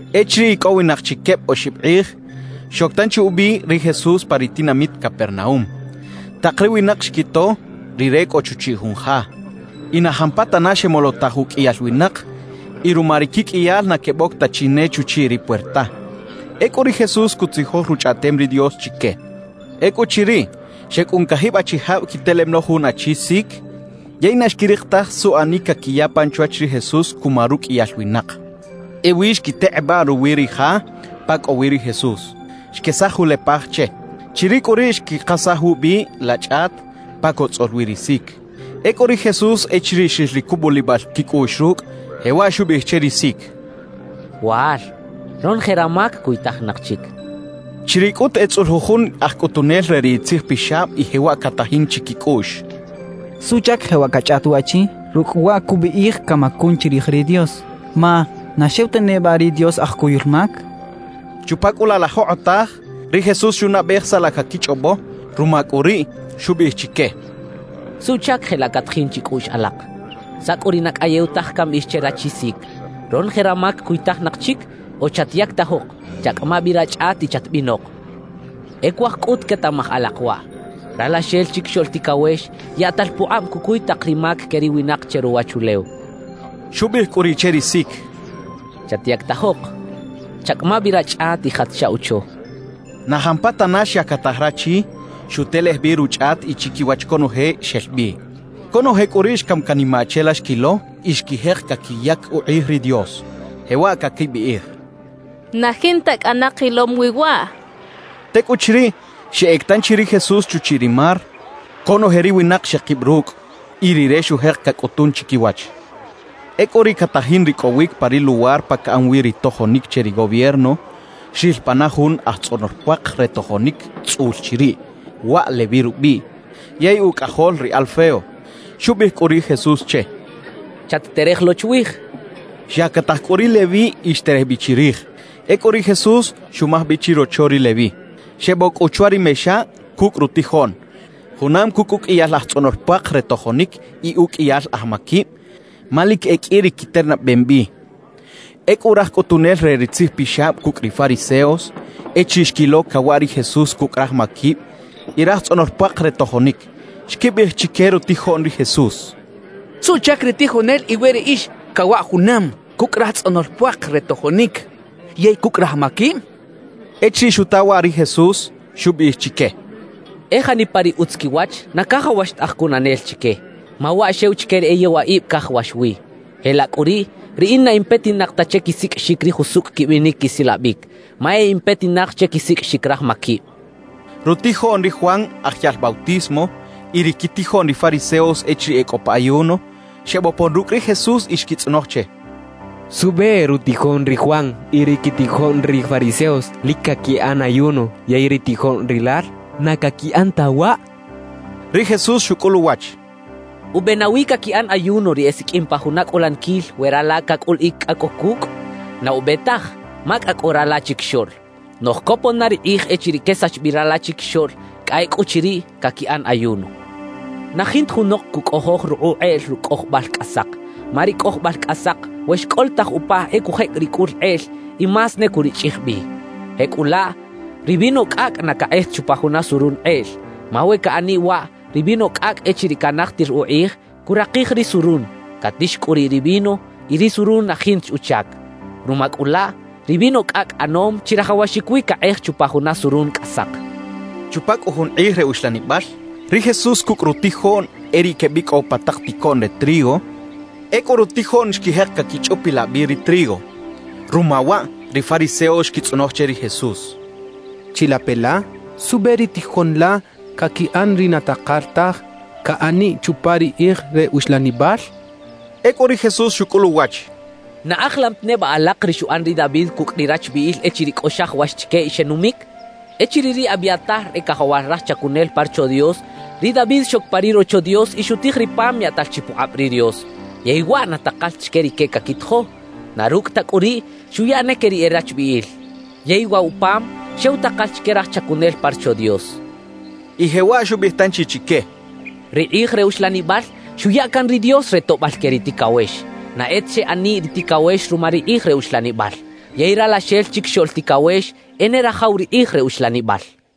Echiriꞌ ikꞌowinaq chi kebꞌ oxibꞌ qꞌij, xok tanchi ubꞌi ri Jesús pa ri tinamit Capernaúm. Taq ri winaq xkito Rire kꞌo chuchiꞌ jun ja. Y na jampatana xemolotaj ukꞌiyal winaq y ruma ri kikꞌiyal na kebꞌok ta chi ne chuchiꞌ ri puerta. Ekꞌu ri Jesús kutzijoj Ruchꞌaꞌtem ri Dios chike. Ekꞌuchiriꞌ, xekꞌun kajibꞌ achijabꞌ kitelem lo jun achi sik. Yey na xkiriq taj suꞌanik kakiya pan chwach ri Jesús kuma rukꞌiyal winaq. Ewi xkiteqꞌebꞌaꞌ ruwi ri ja pa kꞌo wi ri Jesús, xkesaj julepaj che. Chiriꞌ kꞌu riꞌ xkiqasaj wubꞌi la chꞌat pa kotzꞌol wi ri sik. Ekꞌu ri Jesús echiriꞌ xril ri kubꞌulibꞌal kikꞌuꞌx rukꞌ, jewaꞌ xubꞌiꞌij che ri sik: —Wal, ronoje ramak kuytajinaq chik —xchaꞌ. Chiriꞌ kꞌut etzꞌul jujun aj kꞌutunel re ri tzijpixabꞌ y jewaꞌ katajin chikikꞌuꞌx: «¿Suꞌchak jewaꞌ kachꞌaꞌt waꞌchi? Rukꞌ wa kubꞌiꞌij kamakun chirij ri Dios. Ma ¿na xew ta nebꞌa ri Dios aj kuyul mak?» Chupa kꞌu laꞌ la joqꞌotaj, ri Jesús xunaꞌbꞌej saꞌ la kakichꞌobꞌo; ruma kꞌu riꞌ, xubꞌiꞌij chike: —¿Suꞌchak jelaꞌ katajin chikꞌuꞌx alaq? ¿Saꞌ kꞌu ri na kꞌayew taj kambꞌiꞌij che rachi sik: “Ronoje ramak kuytajinaq chik” o “Chatyaktajoq, chakꞌama bꞌi rachꞌat y chatbꞌinoq”? E kuaj kꞌut ketaꞌmaj alaq waꞌ: Ralaxel Chikixoꞌl Tikawex yaꞌtal puqꞌabꞌ kukuy taq ri mak ke ri winaq che ruwachulew —xchaꞌ. Xubꞌiꞌij kꞌu riꞌ che ri sik: —Chatyaktajoq, chakꞌama bꞌi rachꞌat y jat chaꞌwocho —xchaꞌ. Na jampatana xyaktaj rachi, xutelej bꞌi ruchꞌat y chikiwach konoje xel bꞌi. Konoje kꞌu riꞌ xkam kanimaꞌ che la xkilo y xkijeq kakiyak uqꞌij ri Dios, jewaꞌ kakibꞌiꞌij: «¡Na jinta kꞌana qilom wi waꞌ!» kechaꞌ. Tekꞌuchiriꞌ, xeꞌek tanchi ri Jesús chuchiꞌ ri mar. Konoje ri winaq xeqibꞌ rukꞌ, y Rire xujeq kakꞌutun chikiwach. Ekꞌu riꞌ katajin rikꞌowik pa ri luwar pa kaꞌan wi ri tojonik che ri gobierno, xril pana jun aj tzꞌonol puaq re tojonik tzꞌul chiriꞌ. Waꞌ Leví rubꞌiꞌ yey ukꞌajol ri Alfeo. Xubꞌiꞌij kꞌu ri Jesús che: —Chat-terej lo chwij —xchaꞌ. Xyaktajik kꞌu ri Leví y xterej bꞌi chirij. Ekꞌu ri Jesús xumaj bꞌi chirocho ri Leví. Xebꞌok kꞌu chwa ri mexa kukꞌ rutijoꞌn, junam kukꞌ ukꞌiyal aj tzꞌonol puaq re tojonik y ukꞌiyal aj makibꞌ; ma lik e kꞌi ri kiternabꞌem bꞌi. Ekꞌu raj kꞌutunel re ri tzijpixabꞌ kukꞌ ri fariseos, echiriꞌ xkilo kawaꞌ ri Jesús kukꞌ raj makibꞌ y raj tzꞌonol puaq re tojonik, xkibꞌiꞌij chike rutijoꞌn ri Jesús: —¿Suꞌchak ri tijonel iwe riꞌix kawaꞌ junam kukꞌ raj tzꞌonol puaq re tojonik yey kukꞌ raj makibꞌ? —xechaꞌ. Echiriꞌ xuta waꞌ ri Jesús, xubꞌiꞌij chike: —E janipa ri utz kiwach, na kajawax ta aj kunanel chike; ma waꞌ xew chike ri e yewaꞌibꞌ kajawax wi. Jelaꞌ kꞌu riꞌ, riꞌin na in petinaq ta che kisikꞌixik ri jusukꞌ kibꞌinik kisilabꞌik, ma e in petinaq che kisikꞌixik raj makibꞌ —xchaꞌ. Rutijoꞌn ri Juan Aj Yaꞌl Bautismo y ri kitijoꞌn ri fariseos echiriꞌ e kꞌo pa ayuno, xebꞌopon rukꞌ ri Jesús y xkitzꞌonoj che: —¿Suꞌbꞌe rutijoꞌn ri Juan y ri kitijoꞌn ri fariseos lik kakiꞌan ayuno, yey ri tijoꞌn rilal na kakiꞌan ta waꞌ? —xechaꞌ. Ri Jesús xukꞌul uwach: —¿Ubꞌe nawi kakiꞌan ayuno ri esikꞌim pa juna kꞌulanikil we rala kakꞌuliꞌik kꞌa kꞌo kukꞌ? Na ubꞌe taj, ma kꞌa kꞌo rala chikixoꞌl. Noꞌj kopon na ri qꞌij echiriꞌ kesax bꞌi rala chikixoꞌl; kꞌa ekꞌuchiriꞌ, kakiꞌan ayuno. »Na jinta junoq kukꞌojoj ruqꞌuꞌ qꞌeꞌl rukꞌ kꞌojobꞌal kꞌasaq; ma ri kꞌojobꞌal kꞌasaq, we xkꞌolotaj upa, e kujekꞌ ri kꞌul qꞌeꞌl y más ne kurichꞌij bꞌi. Jekꞌulaꞌ ri vino kꞌakꞌ na kaqꞌej ta chupa juna surun qꞌeꞌl. Ma we kaꞌaniꞌ waꞌ, ri vino kꞌakꞌ echiriꞌ kanajtir uqꞌij, kuraqij ri surun, katix kꞌu riꞌ ri vino y ri surun na jinta chi uchak. Ruma kꞌu laꞌ, ri vino kꞌakꞌ ꞌanom chirajawaxik wi kaqꞌej chupa juna surun kꞌasaq —xchaꞌ. Chupa kꞌu jun qꞌij re uxlanibꞌal, ri Jesús kukꞌ rutijoꞌn e riꞌ kebꞌikꞌow pa taq tikoꞌn re trigo. Ekꞌu rutijoꞌn xkijeq kakichꞌupilaꞌ bꞌi ri trigo. Ruma waꞌ ri fariseos xkitzꞌonoj che ri Jesús: —Chilape la, ¿suꞌbꞌe ri tijoꞌn la kakiꞌan ri na taqal taj kaꞌaniꞌ chupa ri qꞌij re uxlanibꞌal? —xechaꞌ. Ekꞌu ri Jesús xukꞌul uwach: —¿Na ajilam ta nebꞌa alaq ri xuꞌan ri David kukꞌ ri rachbꞌiꞌil echiriꞌ kꞌo xajawax chike y xenumik? Echiriꞌ ri Abiatar e kajawal raj chakunel pa Rocho Dios, ri David xok pa ri Rocho Dios y xutij ri pam yaꞌtal chi puqꞌabꞌ ri Dios, yey waꞌ na taqal ta chike rike kakitijo. Na rukꞌ ta kꞌu riꞌ, xuya ne ke ri e rachbꞌiꞌil. Yey waꞌ wa pam, xew taqal chike raj chakunel pa Rocho Dios —xchaꞌ. Y jewaꞌ xubꞌiꞌij tanchi chike: —Ri qꞌij re uxlanibꞌal xuya kan ri Dios re toꞌbꞌal ke ri tikawex; na e ta xeꞌaniꞌ ri tikawex ruma ri qꞌij re uxlanibꞌal. Yey Ralaxel Chikixoꞌl Tikawex e ne rajaw ri qꞌij re uxlanibꞌal —xchaꞌ.